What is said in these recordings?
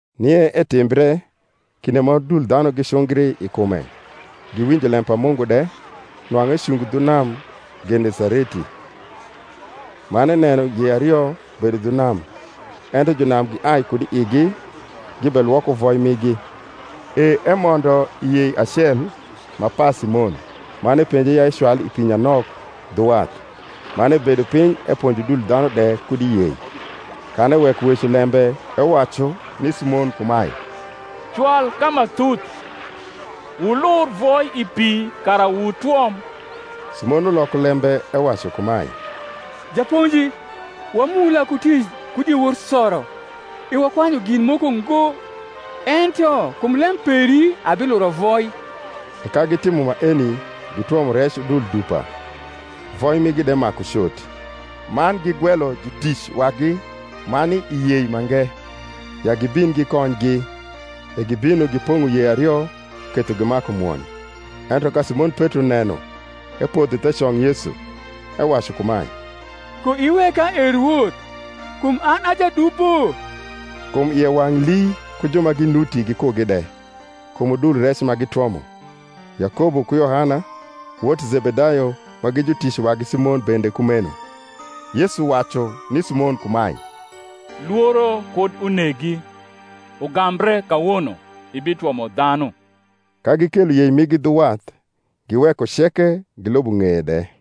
Nie etimbre, kinde ma udul dhanu gicungri i kume giwinjo lem pa Mungu de, nwang’u ecungo dhu nam Genesareti; man eneno yei ario bedo dhu nam: ento junam giai kud i igi, gibelwoko voi migi. E emondo i yei acel, ma pa Simon, man epenje ya ecwal i pi nyanok dhu wath. Man ebedo piny eponjo udul dhanu de kud i yei. Kan eweko weco lembe, ewacu ni Simon kumae, Cwal ka ma thuth, wulur voi i pi kara wutwom. Simon uloko lembe ewacu kumae, Japonji, wamula ku tic ku diewor soro, e wakwanyu gin moko ngo: ento kum lem peri abiluro voi. E ka gitimo maeni, gitwomo rec udul dupa; voi migi de maku cot: man gigwelo jutic wagi ma ni i yei mange, ya gibin gikonygi. E gibino, gipong’o yei ario, ketho gimaku mwony. Ento ka Simon Petro neno, epodho the cong Yesu, ewacu kumae, Koiweka, e Rwoth; kum an a jadubo. Kum ie wang’ lii, ku ju ma ginuti gikugi de, kum udul rec ma gitwomo; Yakobo ku Yohana, wot Zebedayo ma gi jutic wagi Simon, bende kumeno. Yesu wacu ni Simon kumae, Lworo kud unegi; ugambre kawono ibitwomo dhanu. Ka gikelo yei migi dhu wath, giweko ceke, gilubo ng’eye de.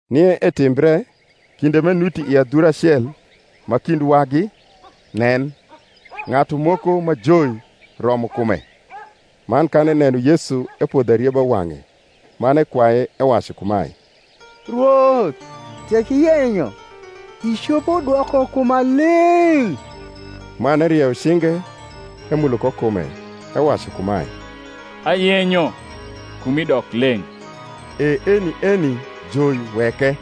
Nie etimbre, kinde m’enuti i adhura acel ma kind wagi, nen, ng’atu moko ma joi romo kume: man kan eneno Yesu, epodho arieba wang’e, man ekwaye, ewacu kumae, Rwoth, tek iyenyo, icopo dwoko kuma leng’. Man erieyo cinge, emulo ko kume, ewacu kumae, Ayenyo; kumi dok leng’. E eni eni joi weke.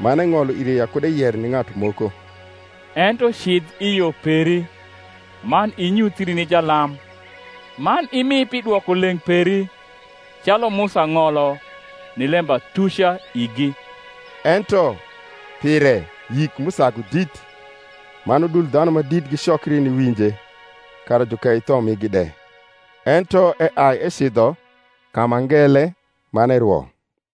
Man eng’olo ire ya kud eyer ni ng’atu moko: ento cidh i yo peri, man inyuthii ni jalam, man imi pi dwokoleng’ peri, calu Musa ng’olo, ni lembatuca igi. Ento pire yik m’usagu dit: man udul dhanu ma dit gicokri niwinje, kara jukei tho migi de. Ento eai ecidho ka ma ngele, man erwo.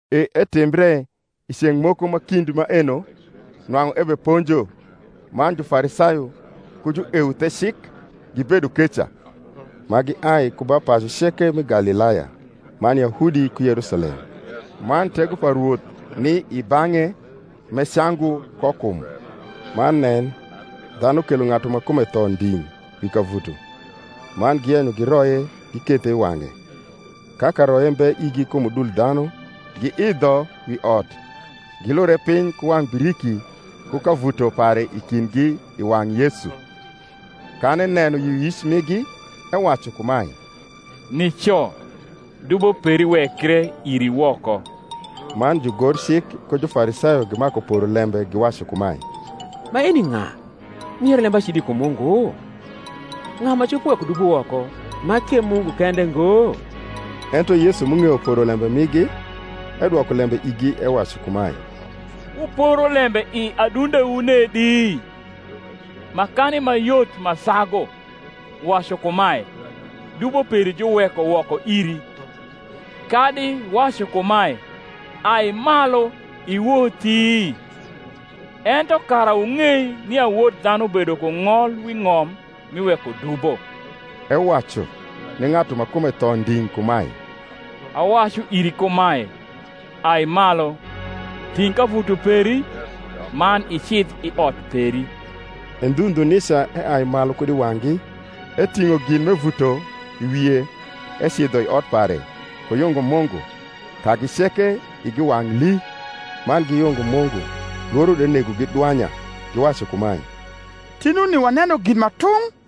E etimbre i ceng’ moko ma kind maeno, nwang’u ebeponjo; man Jufarisayo ku jueuthecik gibedo keca, ma giai ku ba pacu ceke mi Galilaya man Yahudi ku Yerusalem: man tego pa Rwoth ni i bang’e m’ecangu ko kum. Man nen, dhanu kelo ng’atu ma kume tho nding’ wi kavuto: man giyenyo giroye, gikethe i wang’e. Ka karoye mbe igi kum udul dhanu, giidho wi ot, gilure piny ku wang’ biriki ku kavuto pare i kindgi i wang’ Yesu. Kan eneno yioyic migi, ewacu kumae, Nico, dubo peri wekre iri woko. Man jugorcik ku Jufarisayo gimaku poro lembe, giwacu kumae, Maeni ng’a m’uyero lembacidi kum Mungu? Ng’a ma copo weko dubo woko, ma k’e Mungu kende ngo? Ento Yesu m’ung’eyo porolembe migi, edwoko lembe igi ewacu kumae, Wuporo lembe i adundewu nedi? Makani ma yot ma sagu, wacu kumae, Dubo peri juweko woko iri; kadi wacu kumae, Ai malu iwothi? Ento kara wung’ei nia Wod dhanu bedo ku ng’ol wi ng’om mi weko dubo (ewacu ni ng’atu ma kume tho nding’ kumae), Awacu iri kumae, Ai malu, ting’ kavuto peri, man icidh i ot peri. E ndhu ndhu nica eai malu kud i wang’gi, eting’o gin m’evuto i wie, ecidho i ot pare, ku yungo Mungu. Kagi ceke igi wang’ lii, man giyungo Mungu: lworo de negogi dwanya, giwacu kumae, Tinuni waneno gin ma tung’.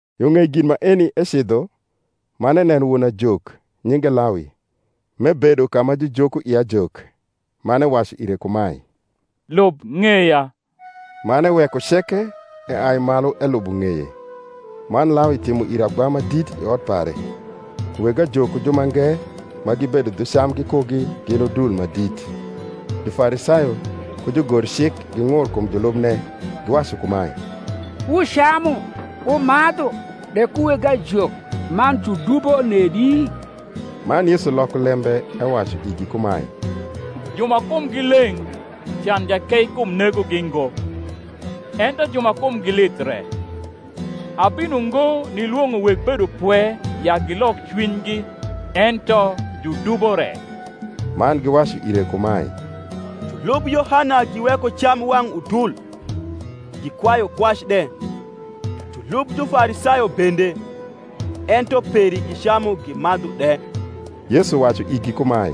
Yo ng’ei gin maeni ecidho, man eneno won ajok, nyinge Lawi, m’ebedo ka ma jujoko ie ajok, man ewacu ire kumae, Lub ng’eya. Man eweko ceke, eai malu elubo ng’eye. Man Lawi timo ire agba ma dit i ot pare: weg ajok ku jumange ma gibedo dhu cam gikugi gin udul ma dit. Jufarisayo ku jugorcik ging’ur kum julubne, giwacu kumae, Wucamu wumadhu de ku weg ajok man judubo nedi? Man Yesu loko lembe ewacu igi kumae, Ju ma kumgi leng’ can jakeikum negogi ngo; ento ju ma kumgi lith re. Abino ngo nilwong’o weg bedopwe ya gilok cwinygi ento judubo re. Man giwacu ire kumae, Julub Yohana giweko cam wang’ udul, gikwayu kwac de; julub Jufarisayo bende; ento peri gicamu gimadhu de. Yesu wacu igi kumae,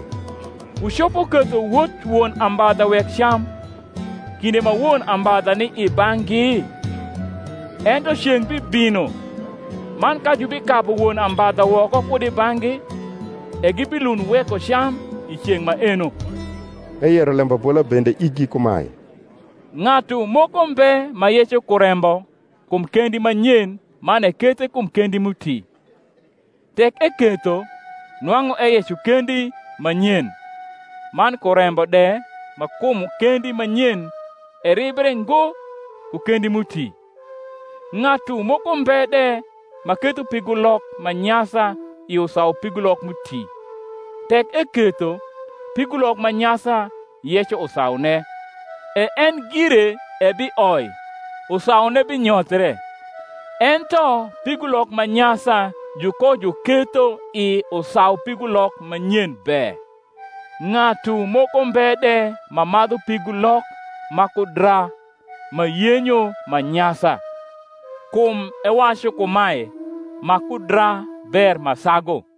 Wucopo ketho wot won ambadha wek cam, kinde ma won ambadha ni i bang’gi? Ento ceng’ bibino; man ka jubikabu won ambadha woko kud i bang’gi, e gibilund weko cam i ceng’ maeno. Eyero lembabola bende igi kumae, Ng’atu moko mbe ma yeco kurembo kum kendi ma nyen man ekethe kum kendi m’uti; tek eketho, nwang’u eyeco kendi ma nyen, man kurembo de ma kum kendi ma nyen eribre ngo ku kendi m’uti. Ng’atu moko mbe de ma ketho pigulok ma nyasa i usaupigulok m’uti; tek eketho, pigulok ma nyasa yeco usaune, e en gire ebioi, usaune binyothre. Ento pigulok ma nyasa jukojuketho i usaupigulok ma nyen be. Ng’atu moko mbe de ma madhu pigulok ma kudra ma yenyo ma nyasa; kum ewacu kumae, Ma kudra ber ma sagu.